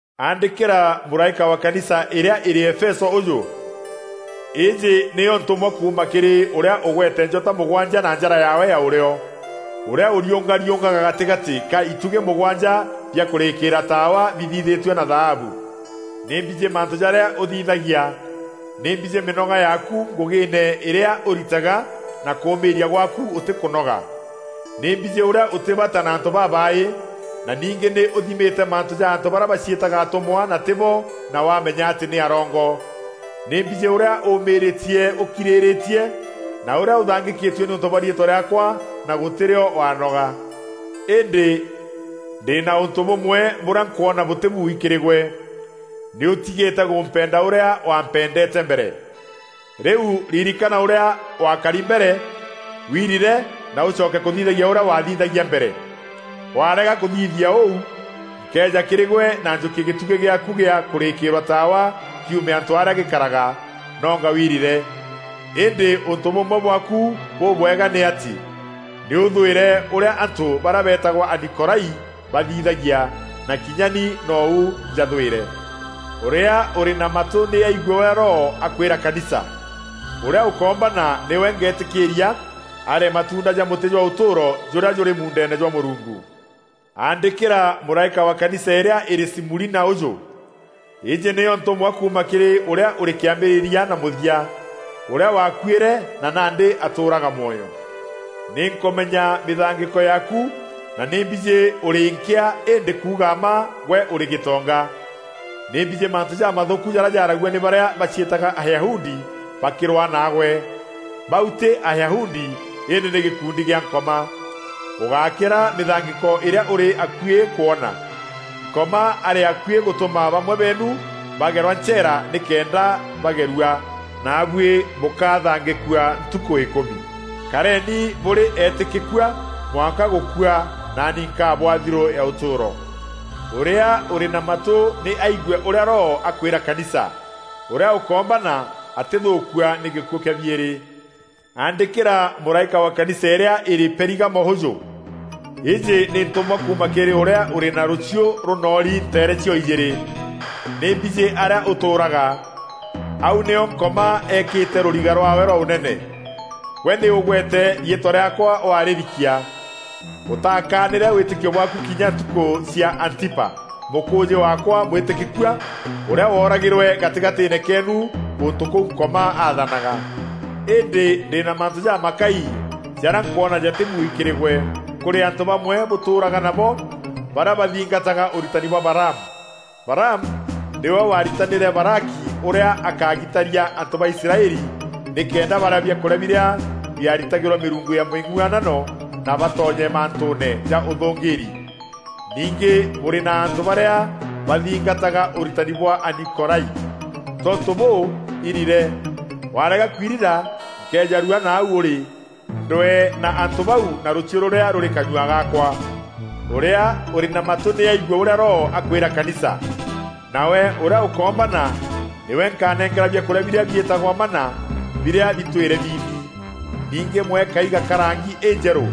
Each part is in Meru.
“Aandîkîra mûraîka wa kanisa îrîa îrî Efeso ûjû: ‘Îîjî nîyo ntûmwa kuuma kîrî ûrîa ûgwete njota mûgwanja na njara yaawe ya ûrîo, ûrîa ûriûngariûngaga gatîgatî ka itugî mûgwanja bia kûrîkîîra taawa bithithîtue na thaabu. “‘Nî mbijî mantû jarîa ûthithagia; nî mbijî mînoga yaaku ngûgîîne irîa ûritaga na kûûmîîria gwaaku ûtîkûnoga. Nî mbijî ûrîa ûtî bata na antû babaî, na ningî nî ûthimîte mantû ja antû barîa baciîtaga atûmwa na tîbo na wamenya atî nî arongo. Nî mbijî ûrîa ûmîîrîtie ûkirîrîtîe na ûrîa ûthangîkîtue nîûntû bwa riîtwa rîaakwa na gûtî rîo waanoga. Îndî ndî na ûntû bûmwe bûrîa nkwona bûtîbuui kîrî gwe: nî ûtigîte gûmpenda ûrîa wampendeete mbere. Rîu ririkana ûrîa wakari mbere, wirire na ûcoke kûthithagia ûrîa wathithagia mbere. Warega kûthithia ûu, nkeeja kîrî gwe na njûkie gîtugî gîaaku gîa kûrîkîîra taawa kiume antû arîa gîkaraga, nonga wirire. Îndî ûntû bûmwe bwaaku bûbwega nî atî, nî ûthwîre ûrîa antû barîa betagwa Anikolai bathithagia, na kinya ni nou njathwîre. Ûrîa ûrî na matû nî aigue ûrîa Roho akwîra kanisa! Ûrîa ûkombana nîwe ngetîkîîria arîe matuunda ja mûtî jwa ûtûûro jûrîa jûrî muundeene jwa Mûrungu.’” “Aandîkîra mûraîka wa kanisa îrîa îrî Simurina ûjû: Îîjî nîyo ntûmwa kuuma kîrî ûrîa ûrî kiambîrîria na mûthia, ûrîa wakuîre na nandî atûûraga mwoyo. “Nî nkûmenya mîthangîko yaaku na nî mbijî ûrî nkîa îndî kuuga mma gwe ûrî gîtonga. Nî mbijî mantû jamathûûku jarîa jaaragua nî barîa baciîtaga Ayahudi bakîrwaa naagwe. Bau tî Ayahudi îndî nî gîkundi gîa Nkoma. Ûgákîra mîthangîko îrîa ûrî akuî kwona. Nkoma arî akuî gûtûma bamwe beenu bagerwa ncheera nîkenda bagerua. Naabuî bûkathagîîkua ntukû îkûmi. Kareni bûrî eetîkîkua mwanka gûkua naani nkabwaa thirû ya ûtûûro. Ûrîa ûrî na matû nî aigue ûrîa Roho akwîra kanisa. Ûrîa ûkoombana atîthûûkua nî gîkuû kîa biîrî.” “Aandîkîra mûraîka wa kanisa îrîa îrî Perigamo ûjû: Îîjî nî ntûmwa kuuma kîrî ûrîa ûrî na rûchiû rûnoori nteere cio-ijîîrî. “Nî mbijî arîa ûtûûraga: Au nîo Nkoma eekîte rûriga rwaawe rwa ûnene. Gwe nî ûgwete riîtwa rîaakwa warîrikia. Ûtaakanîre wîtîkio bwaaku kinya ntukû cia Antipa, mûkûûjî waakwa mwîtîkîkua, ûrîa woragîîrwe gatîgatîîne keenu gûntû kûu Nkoma athanaga. Îndî ndî na mantû jamakai jarîa nkwona jatîbuui kîrî gwe. Kûrî antû bamwe bûtûûraga nabo barîa bathingataga ûritani bwa Balaamu. Balaamu nîwe waritanîre Baraki ûrîa akagitaria antû ba Israeli nîkenda barîa biakûrîa birîa biaritagîrwa mîrungu ya mîng'uanano na batonye mantûûne ja ûthûngîîri. Ningî bûrî na antû barîa bathingataga ûritani bwa Anikolai. Tontû bûû, irire. Warega kwirira nkeeja rua nau ûrî, ndwee na antû bau na rûchiû rûrîa rûrî kanyua gaakwa. Ûrîa ûrî na matû nî aigue ûrîa Roho akwîra kanisa. Nawe ûrîa ûkoombana nîwe nkanenkera biakûrîa birîa biîtagwa manna birîa bitwîre biithi. Ningî mwee kaiga ka rangi înjerû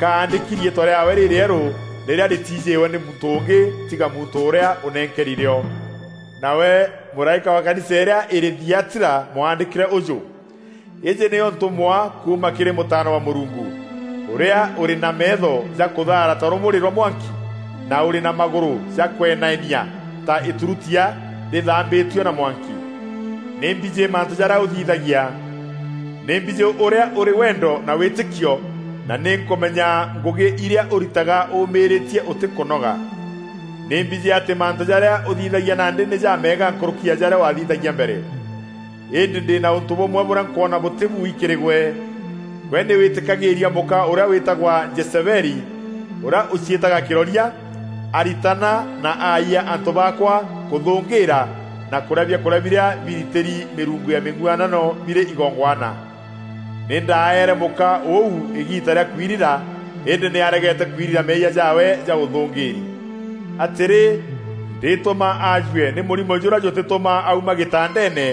kaandîki riîtwa rîaawe rîrîerû rîrîa rîtijîwe nî muntû ûngî tiga muntû ûrîa ûnenkeri rîo.” “Nawe mûraîka wa kanisa îrîa îrî Thiatira, mwandîkîre ûjû: Îîjî nîyo ntûmwa kûûma kîrî Mûtaana wa Mûrungu, ûrîa ûrî na meetho jakûthaara ta rûmûrî rwa mwanki, na ûrî na magûrû jakwenaenia ta îturutia rîthambîtue na mwanki. “Nî mbijî mantû jarîa ûthithagia. Nî mbijî ûrîa ûrî wendo na wîtîkio na nî nkûmenya ngûgî irîa ûritaga ûmîîrîtie ûtîkûnoga. Nî mbijî atî mantû jarîa ûthithagia nandî nî jameega nkûrûki ya jarîa wathithagia mbere. Îndî ndî na ûntû bûmwe bûrîa nkwona bûtîbuui kîrî gwe: gwe nî wîtîkagîîria mûka ûrîa wîtagwa Jezebeli, ûrîa ûciîtaga kîroria, aritana na aayia antû baakwa kûthûngîîra na kûrîa biakûrîa birîa biritîri mîrungu ya mîng'uanano birî igongwana. Nî ndaeere mûka ûu îgiita rîa kwirira îndî nî aregete kwirira meeyia jaawe ja ûthûngîîri. Atîrî, ndîtûma aajue nî mûrimo jûrîa jûtîtûma auma gîtandeene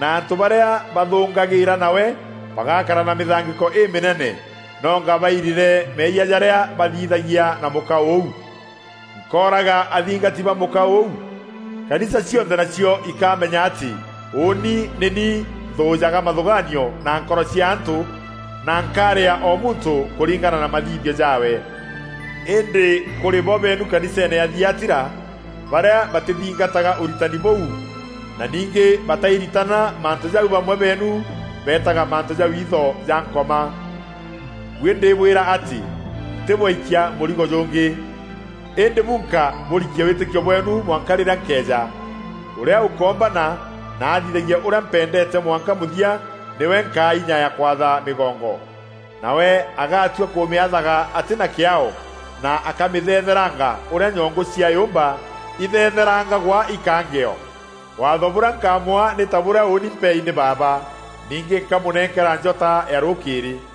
na antû barîa bathûngagîîra nawe bagakara na mîthangîko îmînene, nonga bairire meeyia jarîa bathithagia na mûka ûu. Nkooraga athingati ba mûka ûu. Kanisa cionthe nacio ikamenya atî ûûni nî ni nthûûjaga mathûgaanio na nkoro cia antû na nkarîaa o muntû kûringana na mathithio jaawe. Îndî kûrî bo beenu kaniseene ya Thiatira barîa batîthingataga ûritani bûu na ningî batairitana mantû jau bamwe beenu beetaga ‘mantû ja witho ja Nkoma.’ Buî ndîbwîra atî ntî bwaîkia mûrigo jûngî. Îndî bunka bûrikie wîtîkio bweenu mwanka rîrîa nkeeja. Ûrîa ûkoombana na athithagie ûrîa mpendeete mwanka mûthia, nîwe nkaa inya ya kwatha mîgongo. Nawe agatua kûmîathaga atî na kîaao na akamîthetheranga ûrîa nyongû cia yûmba ithetherangagwa ikaa ngîo. Waatho bûrîa nkamwaa nî ta bûrîa ûûni mpeei nî Baaba. Ningî nkamûnenkera njota ya rûkîîrî.